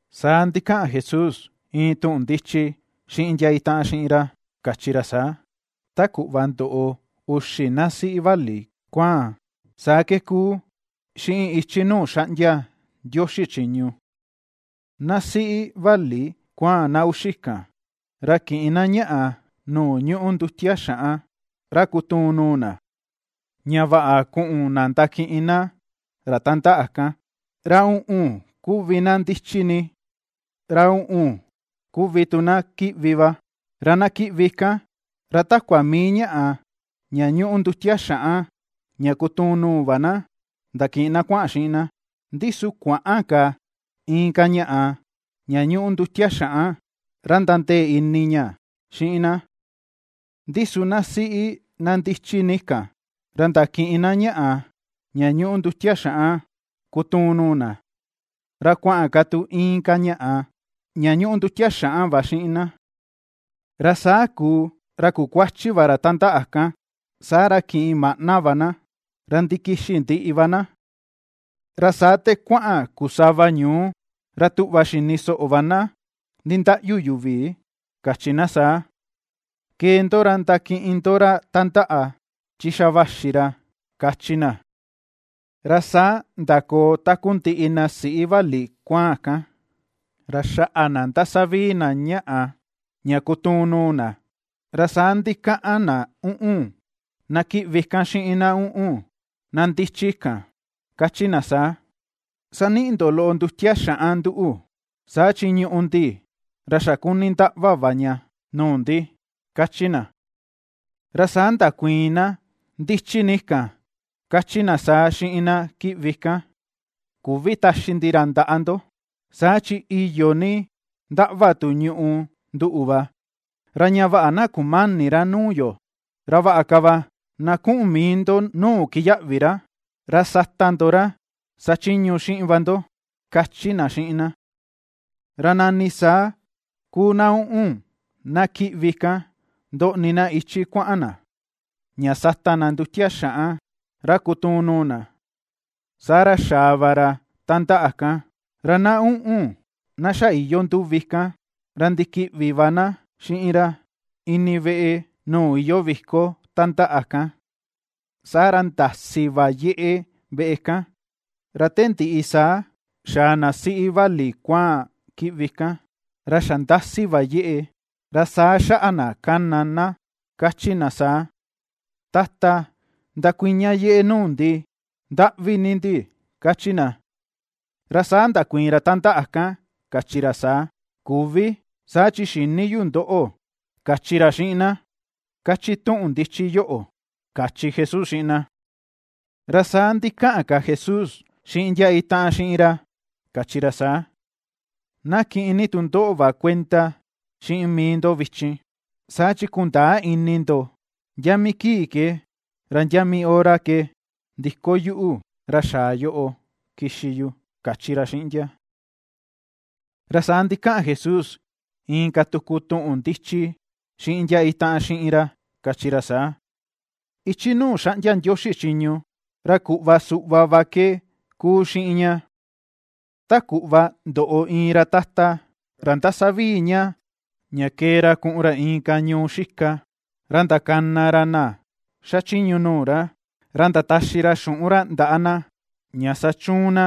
Saa ndikaꞌan Jesús iin tuꞌun ndichi xiꞌin ndia itaꞌan xiꞌin ra kachi ra saa: ―Ta kuꞌva ndoꞌo uxi na siꞌi vali kuaan, saa ke ^kuu, xiꞌin ichi nuu xaꞌndia Ndioxi chiñu. Na siꞌi vali kuaan na uxi kan, ra kiꞌin na ñaꞌa, nuu ñúꞌu ndutia xaꞌan ra kutuun nuu na, ña vaꞌa kuꞌun na ndakiꞌin na ra tandaꞌa kan. Ra uꞌun kuvi na ndichi ni, ra uꞌun kuvi tu na kiꞌvi va. Ra na kiꞌvi kan, ra takua mii ñaꞌa ña ñuꞌu ndutia xaꞌan ña kutuun nuu va na ndakiꞌin na kuaꞌan xiꞌin na, ndi su kuäꞌan ka inka ñaꞌa ña ñuꞌu ndutia xaꞌan ra nandee ka ini ña, xiꞌin na. Ndi su na siꞌi na ndichi ni kan, ra ndakiꞌin na ñaꞌa ña ñuꞌu ndutia xaꞌan kutuun nuu na, ra kuaꞌan ka tu inka ñaꞌa ña ñuꞌu ndutia xaꞌan va xiꞌin na. Ra saa kuu, ra kukuachi va ra tandaꞌa kan, saa ra kiꞌin maꞌna va na, ra ndikixi ndiꞌi va na. Ra saa te kuaꞌan kuu sava ñuu, ra tuꞌva xini soꞌo va na nindaꞌyu yuvi, kachi na saa: “Kee ndo ra ndakiꞌin ndo ra tandaꞌa, chi xa vaxi ra”, kachi na. Ra saa ndakoo takundiꞌi na siꞌi vali kuaan kan, ra xaꞌa na ndasavii na ñaꞌa ña kutuun nuu na. Ra saa ndikaꞌan na uꞌun, na kiꞌvi kan xiꞌin na uꞌun, na ndichi kan, kachi na saa: “Saniꞌi ndo loꞌo ndutia xaꞌan nduꞌu, saa chi ñùꞌù ndi ra xa kuni ndaꞌva va ña nuu ndi”, kachi na. Ra saa ndakuiin na ndichi ni kan kachi na saa xiꞌin na kiꞌvi kan: “Küvi taxi ndi ra ndaꞌa ndo, saa chi iyo ni ndaꞌva tu ñùꞌù nduꞌu va, ra ña vaꞌa na kumäni ra nuu yo. Ra vaꞌa ka va na kuꞌun mii ndo nuu kiyaꞌvi ra, ra sata ndo ra sachiñu xiꞌin va ndo”, kachi na xiꞌin na. Ra nani saa kuu na uꞌun, na kiꞌvi kan, ndoꞌni na ichi kuaꞌan na, ña sata na ndutia xaꞌan ra kutuun nuu na, saa ra xaa va ra tandaꞌa kan, ra na uꞌun, na xa iyoo nduvi kan, ra ndikiꞌvi va na xiꞌin ra ini veꞌe nuu iyoo viko tandaꞌa kan, saa ra ndasi va yeꞌe veꞌe kan. Ra te ndiꞌi, saa xaa na siꞌi vali kuaan kiꞌvi kan, ra xa ndasi va yeꞌe, ra saa xaꞌa na kana na kachi na saa: “Tata, ndakuña yeꞌe nuu ndi, ndaꞌvi ni ndi”, kachi na. Ra saa ndakuiin ra tandaꞌa kan kachi ra saa: “Küvi, saa chi xïni yu ndoꞌo”, kachi ra xiꞌin na, kachi tuꞌun ndichi yoꞌo ―kachi Jesús xiꞌin na. Ra saa ndikaꞌan ka Jesús xiꞌin ndia itaꞌan xiꞌin ra kachi ra saa: ―Na kiꞌin ni tu ndoꞌo va kuenda xiꞌin mii ndo vichin, saa chi kundäa ini ndo ndia mii kii ke, ra ndia mii hora ke ndiko yuꞌu ra xaa yoꞌo kixi yu ―kachi ra xiꞌin ndia. Ra saa ndikaꞌan Jesús inka tuku tuꞌun ndichi xiꞌin ndia itaꞌan xiꞌin ra kachi ra saa: ―Ichi nuu xaꞌndia Ndioxi chiñu, ra kuꞌva suꞌva ke ^kuu xiꞌin ña. Ta kuꞌva ndoꞌo iin ra tata, ra ^ndasavii ña kee ra kuꞌun ra inka ñuu xika, ra ndakana ra na xachiñu nuu ra, ra ndataxi ra xuꞌun ra ndaꞌa na ña sachiñu na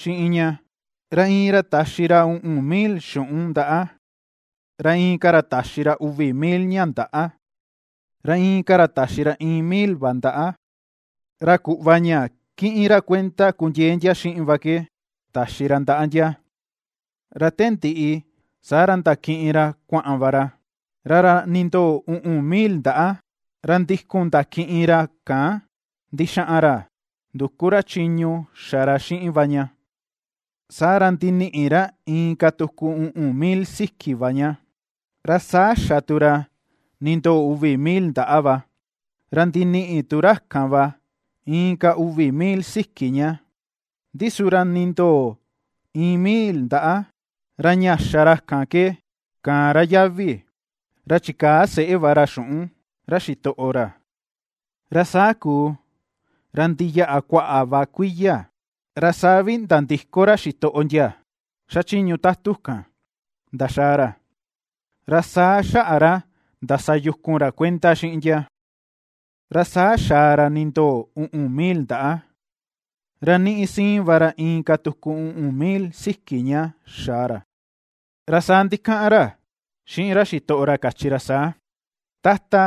xiꞌin ña. Ra iin ra taxi ra uꞌun mil xuꞌun ndaꞌa, ra inka ra taxi ra uvi mil ña ndaꞌa, ra inka ra taxi ra iin mil va ndaꞌa, ra kuꞌva ña kiꞌin ra kuenda kundiee ndia xiꞌin va ke, taxi ra ndaꞌa ndia. Ra te ndiꞌi, saa ra ndakiꞌin ra kuaꞌan va ra. Ra ra nindoo uꞌun mil ndaꞌa, ra ndikun ndakiꞌin ra kan ndixaꞌan ra nduku ra chiñu xa ra xiꞌin va ña, saa ra ndiniꞌi ra inka tuku uꞌun mil siki va ña. Ra saa xa tu ra nindoo uvi mil ndaꞌa va, ra ndiniꞌi tu ra kan va, inka uvi mil siki ña. Ndi su ra nindoo iin mil ndaꞌa, ra ña xa ra kan ke, kaan ra yavi, ra chikaa seꞌe va ra xuꞌun ra xitoꞌo ra. ’Ra saa kuu, ra ndiyaꞌa kuaꞌa va kuiya, ra saa vi nandiko ra xitoꞌo ndia xachiñu tatu kan ndaxaa ra, ra saa xaꞌa ra ndasa yukun ra kuenda xiꞌin ndia. Saa xaa ra nindoo uꞌun mil ndaꞌa, ra niꞌi siin va ra inka tuku uꞌun mil siki ña xaa ra, ra saa ndikaꞌan ra xiꞌin ra xitoꞌo ra kachi ra saa: “Tata,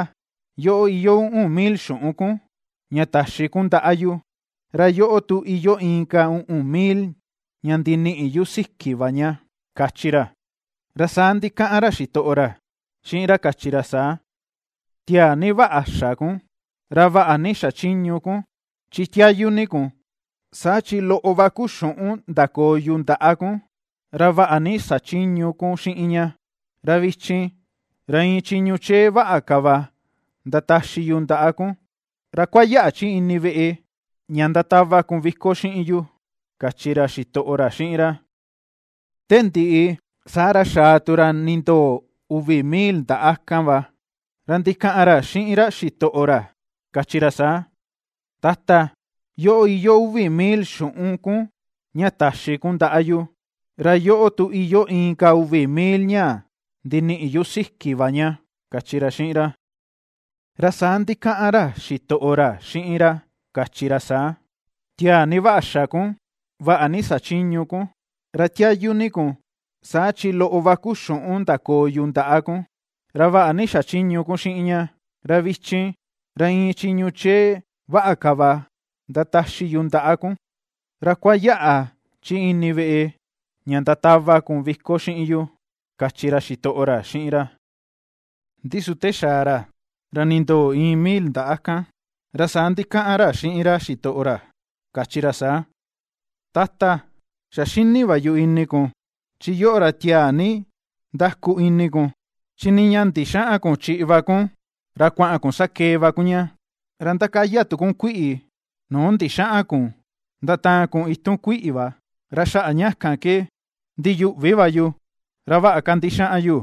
yoꞌo iyoo uꞌun mil xuꞌun kun ña taxi kun ndaꞌa yu, ra yoꞌo tu iyoo inka uꞌun mil ña ndiniꞌi yu siki va ña”, kachi ra. Ra saa ndikaꞌan ra xitoꞌo ra xiꞌin ra kachi ra saa: “Tiaa ni vaꞌa xa kun, ra vaꞌa ni xachiñu kun, chi tiayu ni kun. Saa chi loꞌo va kuu xuꞌun ndakoo yu ndaꞌa kun, ra vaꞌa ni xachiñu kun xiꞌin ña, ra vichin, ra iin chiñu chee vaꞌa ka va ndataxi yu ndaꞌa kun, ra kuayaꞌa chi ini veꞌe ña ndatava kun viko xiꞌin yu”, kachi ra xitoꞌo ra xiꞌin ra. Te ndiꞌi, saa ra xaa tu ra nindoo uvi mil ndaꞌa kan va, ra ndikaꞌan ra xiꞌin ra xitoꞌo ra kachi ra saa: “Tata, yoꞌo iyoo uvi mil xuꞌun kun ña taxi kun ndaꞌa yu, ra yoꞌo tu iyoo inka uvi mil ña ndiniꞌi yu siki va ña”, kachi ra xiꞌin ra. Ra saa ndikaꞌan ra xitoꞌo ra xiꞌin ra kachi ra saa: “Tiaa ni vaꞌa xa kun, vaꞌa ni xachiñu kun, ra tiayu ni kun, saa chi loꞌo va kuu xuꞌun ndakoo yu ndaꞌa kun, ra vaꞌa ni xachiñu kun xiꞌin ña. Ra vichin, ra iin chiñu chee vaꞌa ka va ndataxi yu ndaꞌa kun, ra kuayaꞌa chi ini veꞌe ña ndatava kun viko xiꞌin yu”, kachi ra xitoꞌo ra xiꞌin ra. Ndi su te xaa ra, ra nindoo iin mil ndaꞌa kan, ra saa ndikaꞌan ra xiꞌin ra xitoꞌo ra kachi ra saa: “Tata, xa xini va yu ini kun, chi yoꞌo ra tiaa ni ndaku ini kun, chi nii ña ndixäꞌan kun chiꞌi va kun, ra kuaꞌan kun sakee va kun ña, ra ndakaya kun kuiꞌi nuu ndixäꞌan kun ndataan kun itun kuiꞌi va. Ra xaꞌa ña kan ke ndiyuꞌvi va yu, ra vaꞌa ka ndixaꞌan yu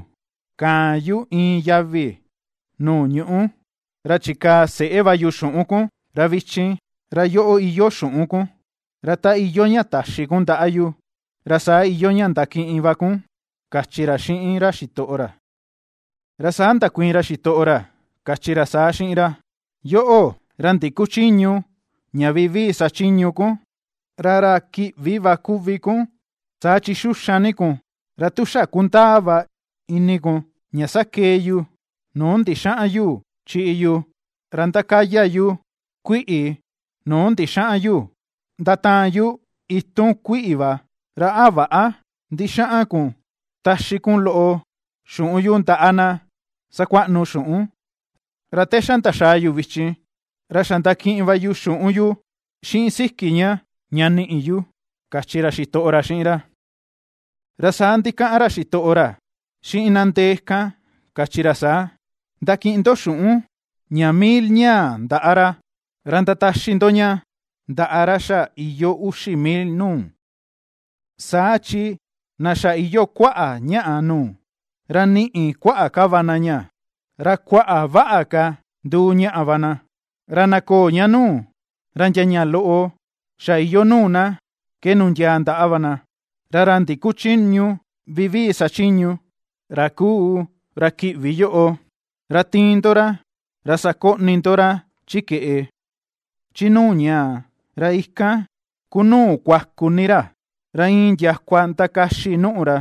kaan yu iin yavi nuu ñuꞌu, ra chikaa seꞌe va yu xuꞌun kun, ra vichin, ra yoꞌo iyoo xuꞌun kun, ra ta iyoo ña taxi kun ndaꞌa yu, ra saa iyoo ña ndakiꞌin va kun”, kachi ra xiꞌin ra xitoꞌo ra. Ra saa ndakuiin ra xitoꞌo ra kachi ra saa xiꞌin ra: “Yoꞌo, ra ndikuchïñu ña vivii sa chiñu kun, ra ra kiꞌvi va kuvi kun, saa chi xuxan ni kun, ra tu xa kundaa va ini kun ña sakee yu nuu ndixäꞌan yu chiꞌi yu, ra ndakaya yu kuiꞌi nuu ndixäꞌan yu ndataan yu itun kuiꞌi va, ra, ¿a väꞌa ndixaꞌan kun taxi kun loꞌo xuꞌun yu ndaꞌa na sakuaꞌnu xuꞌun? Ra te xa ndaxaa yu vichin, ra xa ndakiꞌin va yu xuꞌun yu xiꞌin siki ña, ña niꞌi yu”, kachi ra xitoꞌo ra xiꞌin ra. Ra saa ndikaꞌan ra xitoꞌo ra xiꞌin na ndee kan kachi ra saa: “Ndakiꞌin ndo xuꞌun, ña mil ñaa ndaꞌa ra, ra ndataxi ndo ña, ndaꞌa ra xa iyoo uxi mil nuu. Saa chi na xa iyoo kuaꞌa ñaꞌa nuu, ra niꞌi kuaꞌa ka va na ña, ra kuaꞌa vaꞌa ka nduu ñaꞌa va na, ra na köo ña nuu, ra ndia ña loꞌo xa iyoo nuu na ke nundiaa ndaꞌa va na. Ra ra ndikuchïñu vivii sa chiñu, ra kuu ra kiꞌvi yoꞌo, ra tiin ndo ra, ra sakoꞌni ndo ra chi keꞌe, chi nuu ñaa, ra ikan ku nuu kuaku ni ra, ra iin ndiakua ndakaxi nùꞌù ra”,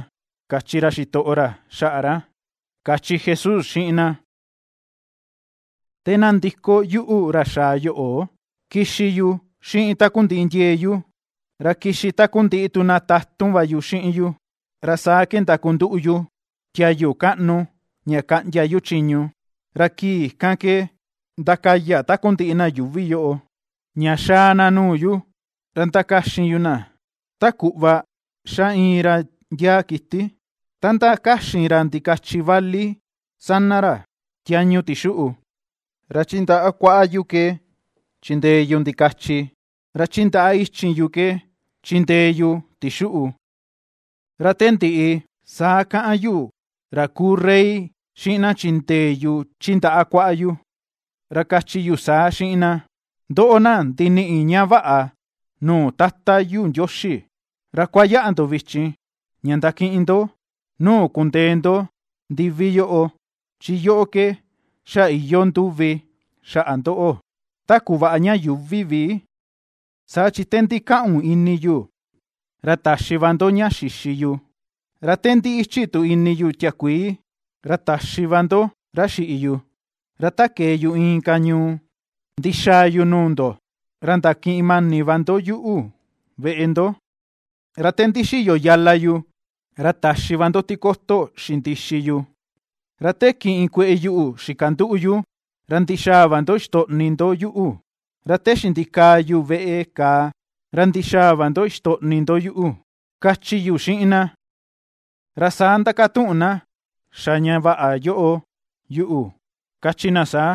kachi ra xitoꞌo ra xaꞌa ra ―kachi Jesús xiꞌin na. ’Te na ndiko yuꞌu ra xaa yoꞌo, kixi yu xiꞌin takundiꞌi ndiee yu, ra kixi takundiꞌi tu na tatun va yu xiꞌin yu, ra saa ke ndakunduꞌu yu tiayu kaꞌnu ña kaꞌndia yu chiñu. Ra kii kan ke ndakaya takundiꞌi na yuuvi yoꞌo, ña xaa na nuu yu, ra ndakaxin yu na, ta kuꞌva ^xa iin ra ndiaa kiti, ta ndakaxin ra ndikachi vali sana ra, tiañu tixuꞌu. Ra chi ndaꞌa kuaꞌa yu ke chindee yu ndikachi, ra chi ndaꞌa ichin yu ke chindee yu tixuꞌu. Ra te ndiꞌi, saa kaꞌan yuꞌu, ra kuu Rey, xiꞌin na chindee yu chi ndaꞌa kuaꞌa yu, ra kachi yu saa xiꞌin na: “Ndoꞌo, na ndiniꞌi ña vaꞌa nuu Tata yu Ndioxi, ra kuayaꞌa ndo vichin, ña ndakiꞌin ndo nuu kundee ndo ndivi yoꞌo, chi yoꞌo ke xa iyoo ndúvi xaꞌa ndoꞌo, te kuvaꞌa ña yuuvi vi. Saa chi te ndikaꞌun ini yu, ra taxi va ndo ña xixi yu; ra te ndi ichi tu ini yu tiakuii, ra taxi va ndo ra xiꞌi yu; ra ta kee yu inka ñuu ndixaa yu nuu ndo, ra ndakiꞌin mani va ndo yuꞌu veꞌe ndo; ra te ndixiyo yala yu, ra taxi va ndo tikoto xindixi yu; ra te kiꞌin kueꞌe yu xikanduꞌu yu, ra ndixaa va ndo ixtoꞌni ndo yuꞌu; ra te xindikaa yu veꞌe kàà, ra ndixaa va ndo ixtoꞌni ndo yuꞌu”, kachi yu xiꞌin na. Ra saa ndakatuꞌun na xa ña vaꞌa yoꞌo yuꞌu, kachi na saa: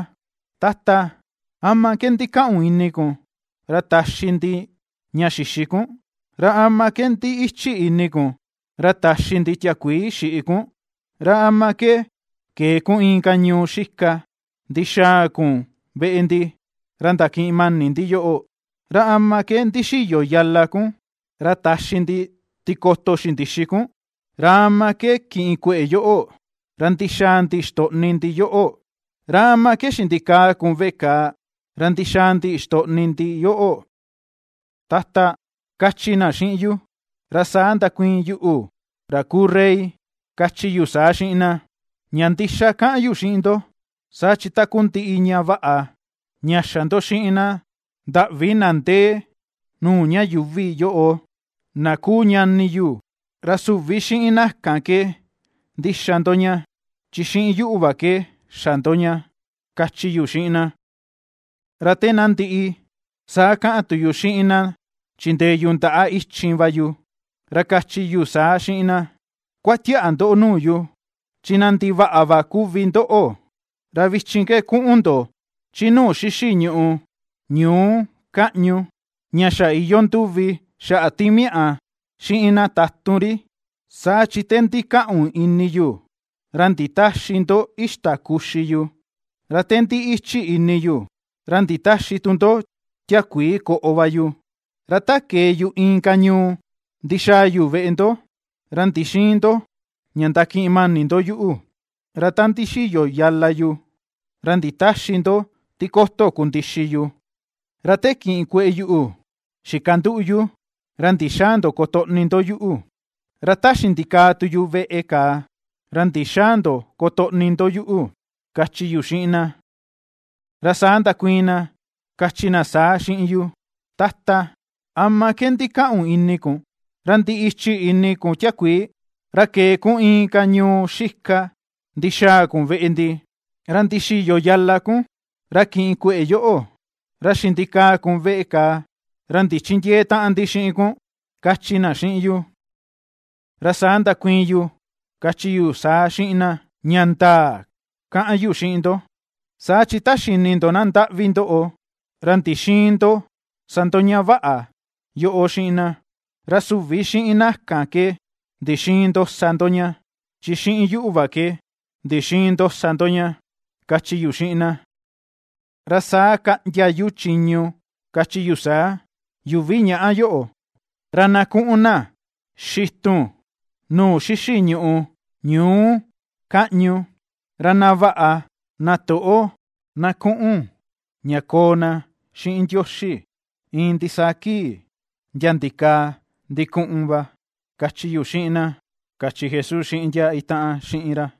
“Tata, ¿ama ke ndikaꞌun ini kun, ra taxi ndi ña xixi kun? ¿Ra ama ke ndi ichi ini kun, ra taxi ndi tiakuii xiꞌi kun? ¿Ra ama ke kee kun inka ñuu xika ndixaa kun veꞌe ndi, ra ndakiꞌin mani ndi yoꞌo? ¿Ra ama ke ndixiyo yala kun, ra taxi ndi tikoto xindixi kun? ¿Ra ama ke kiꞌin kueꞌe yoꞌo, ra ndixaa ndi ixtoꞌni ndi yoꞌo? ¿Ra ama ke xindikaa kun veꞌe kàà, ra ndixaa ndi ixtoꞌni ndi yoꞌo, Tata?”, kachi na xiꞌin yu. Ra saa ndakuiin yuꞌu, ra kuu Rey, kachi yu saa xiꞌin na: “Ña ndixa kaꞌan yu xiꞌin ndo, saa chi takundiꞌi ña vaꞌa, ña xa ndo xiꞌin na ndaꞌvi na ndee nuu ña yuuvi yoꞌo, na kuu ñani yu, ra süvi xiꞌin na kan ke ndixa ndo ña, chi xiꞌin yuꞌu va ke xa ndo ña”, kachi yu xiꞌin na. Ra te na ndiꞌi, saa kaꞌan tu yu xiꞌin na chindee yu chi ndaꞌa ichin va yu, ra kachi yu saa xiꞌin na: “Kuatiaꞌa ndo nuu yu, chi na ndivaꞌa va kuvi ndoꞌo, ra vichin ke kuꞌun ndo chi nuu xixi ñùꞌù, ñuu kaꞌñu, ña xa iyoo ndúvi xaꞌa timiaꞌa xiꞌin na tatun ri. Saa chi te ndikaꞌun ini yu, ra nditäxi ndo ixta kuxi yu; ra te ndi ichi ini yu, ra nditäxi tu ndo tiakuii koꞌo va yu; Ra ta kee yu inka ñuu ndixaa yu veꞌe ndo, ra ndixïin ndo ña ndakiꞌin mani ndo yuꞌu; ra ta ndixiyo yala yu, ra nditäxi ndo tikoto kundixi yu; ra te kiꞌin kueꞌe yuꞌu xikanduꞌu yu, ra ndixäa ndo kotoꞌni ndo yuꞌu; ra ta xindikaa tu yu veꞌe kàà, ra ndixäa ndo kotoꞌni ndo yuꞌu”, kachi yu xiꞌin na. Ra saa ndakuiin na, kachi na saa xiꞌin yu: “Tata, ¿ama ke ndikaꞌun ini kun, ra ndi ichi ini kun tiakuii, ra kee kun inka ñuu xika ndixaa kun veꞌe ndi, ra ndixiyo yala kun, ra kiꞌin kueꞌe yoꞌo, ra xindikaa kun veꞌe kàà, ra ndichindiëe taꞌan ndi xiꞌin kun?”, kachi na xiꞌin yu. Ra saa ndakuiin yu kachi yu saa xiꞌin na: “Ña ndaa kaꞌan yu xiꞌin ndo, saa chi ta xini ndo na ndaꞌvi ndoꞌo, ra ndixïin ndo sa ndo ña vaꞌa yoꞌo xiꞌin na, ra süvi xiꞌin na kan ke ndixïin ndo sa ndo ña, chi xiꞌin yuꞌu va ke ndixïin ndo sa ndo ña”, kachi yu xiꞌin na. Ra saa kaꞌndia yu chiñu kachi yu saa: “Yuvi ñaꞌa yoꞌo, ra na ku̱ꞌu̱n na xitun nuu xixi ñùꞌù ñuu kaꞌñu; ra na vaꞌa, na toꞌo na kuꞌun ña koo na xiꞌin Ndioxi, iin ndisaa kii, ndia ndikaa ndikuꞌun va”, kachi yu xiꞌin na ―kachi Jesús xiꞌin ndia itaꞌan xiꞌin ra.